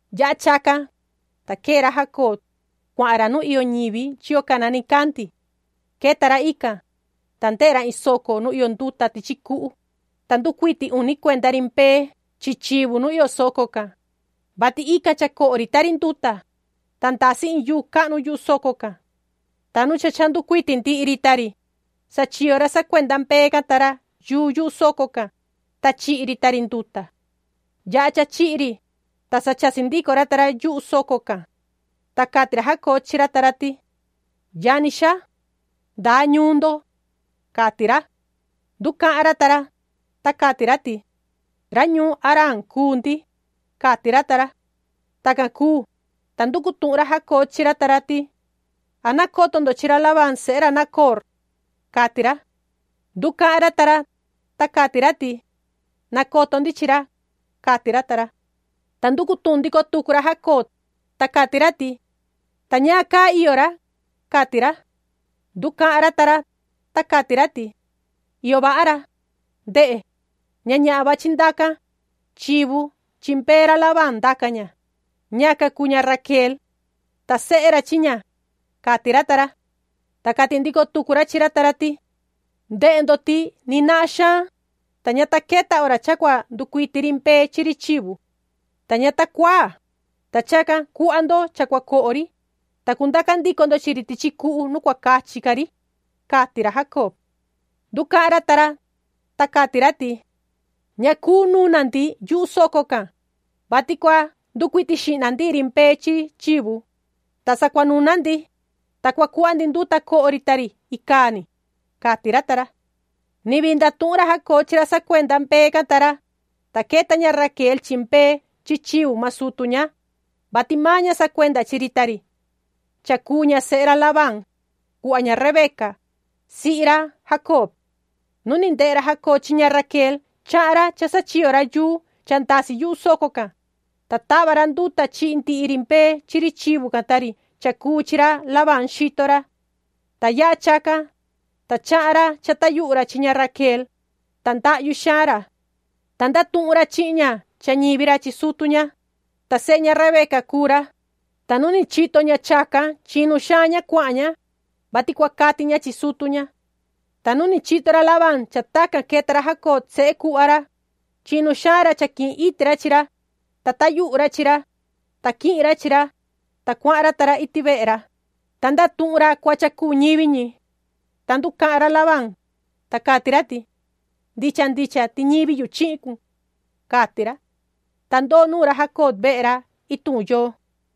Yaha chacan, ta quee ra Jacob, cuahan ra nu iyo ñivi chiyo cana nicandi. Queta ra ican, ta ndehe ra in soco nu iyo nduta tichi cuhu, ta nducuiti uni cuenda ri mbee chi chivu nu iyo soco can, vati ican cha coho ri ta ri nduta, ta ndasi in yuu cahnu yuhu soco can. Ta nu cha cha nducuiti ndihi ri ta ri, sachiyo ra sacuenda mbee can ta ra yuu yuhu soco can, ta chihi ri ta ri nduta. Yaha cha chihi ri, ta sa chasi ndico ra ta ra yuhu soco can. Ta cati ra Jacob chi ra ta ra ti: ―Yani xaa. ¿Ndaa ñuun ndo? ―cati ra. Nducahan ra ta ra, ta cati ra ti: ―Ra ñuun Haraan cuu ndi ―cati ra ta ra. Tacan cuu, ta nducu tuhun ra Jacob chi ra ta ra ti: ―¿An nacoto ndo chi ra Labán sehe ra Nacoor? ―cati ra. Nducahan ra ta ra, ta cati ra ti: ―Nacoto ndi chi ra ―cati ra ta ra. Ta nducu tuhun ndico tucu ra Jacob, ta cati ra ti: ―¿Ta ñaan caa iyo ra? ―cati ra. Nducahan ra ta ra, ta cati ra ti: ―Iyo vaha ra. Ndehe, ña ñahan vachi ndacan, chivu chi mbee ra Labán ndaca ña, ñacan cuu ña Raquel. Ta sehe ra chi ña ―cati ra ta ra. Ta cati ndico tucu ra chi ra ta ra ti: ―Ndehe ndo ti ni nahan xaan, ta ña ta queta hora cha cua nducuiti ri mbee chi ri chivu. Ta ña ta cuaa, ta chacan cuhva ndo cha cua coho ri, ta cundaca ndico ndo chi ri tichi cuhu nu cua cachi ca ri ―cati ra Jacob. Nducahan ra ta ra, ta cati ra ti: ―Ña cuu nuna ndi yuhu soco can, vati cua nducuiti xihna ndihi ri mbee chi chivu, ta sa cua nuna ndi, ta cua cuhva ndi nduta coho ri ta ri icaa ni ―cati ra ta ra. Ni vii ndatuhun ra Jacob chi ra sacuenda mbee can ta ra, ta queta ña Raquel chi mbee chi chivu maan sutu ña, vati maan ña sacuenda chi ri ta ri. Cha cuu ña sehe ra Labán, cuhva ña Rebeca, sihi ra Jacob. Nu ni ndehe ra Jacob chi ña Raquel chahan ra cha sachiyo ra yuu cha ndasi yuhu soco can, ta tava ra nduta chihi ndihi ri mbee chi ri chivu can ta ri cha cuu chi ra Labán xito ra. Ta yaha chacan, ta chahan ra cha tayuhu ra chi ña Raquel, ta ndahyu xaan ra. Ta ndatuhun ra chihin ña cha ñivi ra chi sutu ña, ta sehe ña Rebeca cuu ra, ta nu ni chito ña chacan chinu xaan ña cuahan ña, vati cua cati ña chi sutu ña. Ta nu ni chito ra Labán cha tacan queta ra Jacob sehe cuhva ra, chinu xaan ra cha quihin iti ra chi ra, ta tayuhu ra chi ra, ta quihin ra chi ra, ta cuahan ra ta ra iti vehe ra, ta ndatuhun ra cuhva cha cuu ñivi ñi. Ta nducahan ra Labán, ta cati ra ti: “¡Ndicha ndicha ti ñivi yu chihin cun!”, cati ra. Ta ndoo nuun ra Jacob vehe ra ituhun yoo.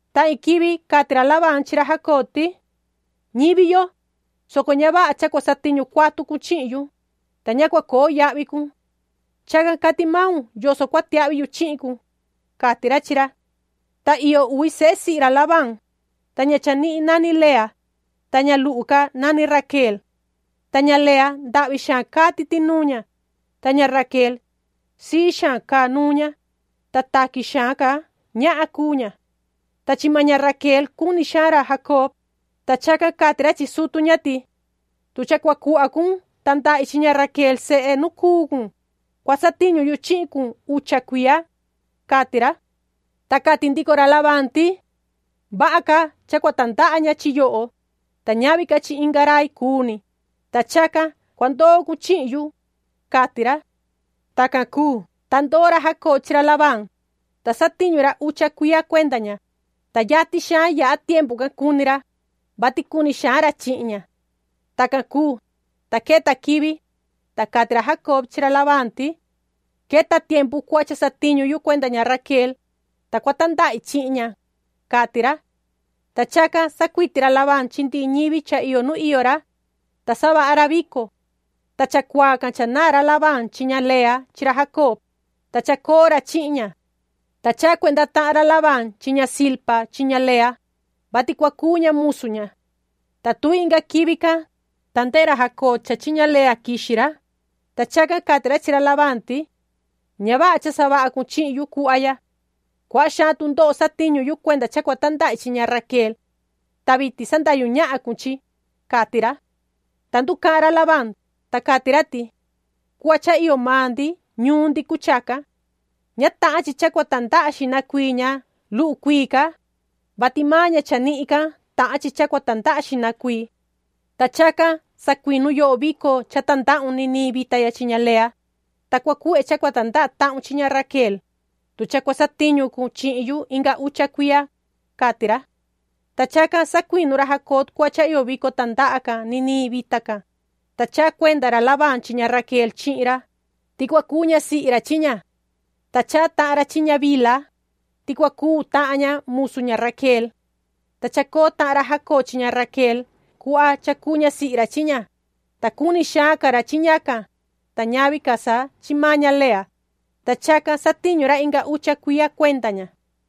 Ta iin quivi cati ra Labán chi ra Jacob ti: ―Ñivi yo, soco ña vaha cha cua satiñu cuatu cun chihin yu, ta ña cua coo yahvi cun. Chacan cati maun yoso cua tiahvi yu chihin cun ―cati ra chi ra. Ta iyo uvi sehe sihi ra Labán, ta ña chanihin nani Lea, ta ña luhu ca nani Raquel. Ta ña Lea, ndahvi xaan caa titi nuun ña, ta ña Raquel, sii xaan caa nuun ña, ta taqui xaan ca ñahan cuu ña. Ta chi maan ña Raquel cuni xaan ra Jacob, ta chacan cati ra chi sutu ña ti: ―Tu cha cua cuhva cun tandahi chi ña Raquel sehe nu cuu cun, cua satiñu yu chihin cun ucha cuiya ―cati ra. Ta cati ndico ra Labán ti: ―Vaha ca cha cua tandaha ña chi yoho, ta ñavi ca chi inga rai cuu ni, ta chacan cua ndoo cun chihin yu ―cati ra. Tacan cuu, ta ndoo ra Jacob chi ra Labán, ta satiñu ra ucha cuiya cuenda ña, ta yatin xaan yaha tiempu can cuni ra, vati cuni xaan ra chihin ña. Tacan cuu, ta queta quivi, ta cati ra Jacob chi ra Labán ti: ―Queta tiempu cuhva cha satiñu yu cuenda ña Raquel, ta cua tandahi chihin ña ―cati ra. Ta chacan sacuiti ra Labán chi ndihi ñivi cha iyo nu iyo ra, ta savaha ra vico. Ta chacuaa can cha naan ra Labán chi ña Lea chi ra Jacob, ta chacoo ra chihin ña. Ta chaha cuenda tahan ra Labán chi ña Zilpa chi ña Lea, vati cua cuu ña musu ña. Ta tuvi inga quivi can, ta ndehe ra Jacob cha chi ña Lea quixi ra, ta chacan cati ra chi ra Labán ti: ―Ña vaha cha savaha cun chihin yu cuhva ya. Cuaha xaan tundoho satiñu yu cuenda cha cua tandahi chi ña Raquel. Ta vitin sandahyu ñahan cun chi ―cati ra. Ta nducahan ra Labán, ta cati ra ti: ―Cuhva cha iyo maan ndi ñuun ndi cuu chacan. Ña tahan chi cha cua tandaha xihna cuii ña luhu cuii ca, vati maan ña chanihin ca tahan chi cha cua tandaha xihna cuii. Ta chacan sacuinu yoho vico cha tandahun niniin vita ya chi ña Lea, ta cua cuhve cha cua tandaha tahun chi ña Raquel, tu cha cua satiñu cun chihin yu inga ucha cuiya ―cati ra. Ta chacan sacuinu ra Jacob cuhva cha iyo vico tandaha can niniin vita can, ta chaha cuenda ra Labán chi ña Raquel chihin ra, ti cua cuu ñasihi ra chi ña. Ta chaha tahan ra chi ña Bilha, ti cua cuu tahan ña musu ña Raquel. Ta chacoo tahan ra Jacob chi ña Raquel cuhva cha cuu ñasihi ra chi ña, ta cuni xaan ca ra chi ñacan, ta ñavi ca sa chi maan ña Lea, ta chacan satiñu ra inga ucha cuiya cuenda ña.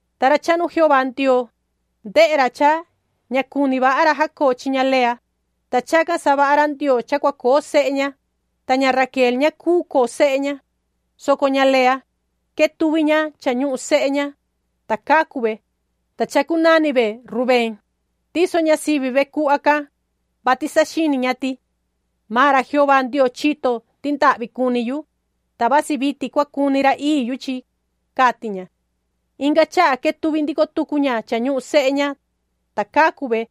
Ta ra chahnu Jehová Ndioo, ndehe ra cha ña cuni vaha ra Jacob chi ña Lea, ta chacan savaha ra Ndioo cha cua coo sehe ña, ta ña Raquel ña cuu coo sehe ña, soco ña Lea, quetuvi ña cha ñuhun sehe ña, ta cacu ve, ta chacunani ve Rubén. Tiso ña sivi ve cuhva can, vati saxini ña ti: “Maan ra Jehová Ndioo chito ti ndahvi cuni yu, ta vasi vitin cua cuni ra ii yu chi”, cati ña. Inga chaha quetuvi ndico tucu ña cha ñuhun sehe ña, ta cacu ve,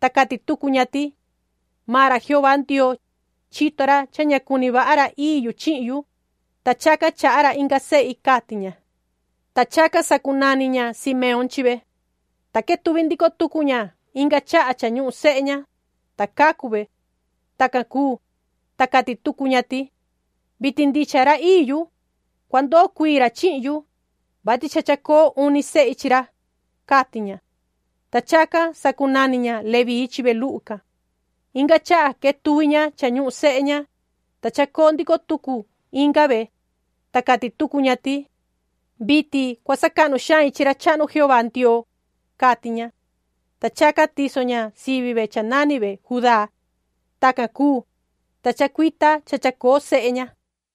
ta cati tucu ña ti: “Maan ra Jehová Ndioo, chito ra cha ña cuni vaha ra ii yu chihin, ta chacan chaha ra inga sehi”, cati ña. Ta chacan sacunani ña Simeón chi ve. Ta quetuvi ndico tucu ña inga chaha cha ñuhun sehe ña, ta cacu ve. Tacan cuu, ta cati tucu ña ti: “Vitin ndicha ra ii yu, cua ndoo cuii ra chihin yu, vati cha chacoo uni tahan sehi chi ra”, cati ña. Ta chacan sacunani ña Leví chi ve luhu can. Inga chaha quetuvi ña cha ñuhun sehe ña, ta chacoo ndico tucu inga ve, ta cati tucu ña ti: “Vitin cua sacahnu xain chi ra chahnu Jehová Ndioo”, cati ña. Ta chacan tiso ña sivi ve cha nani ve Judá. Tacan cuu, ta chacuita cha chacoo sehe ña.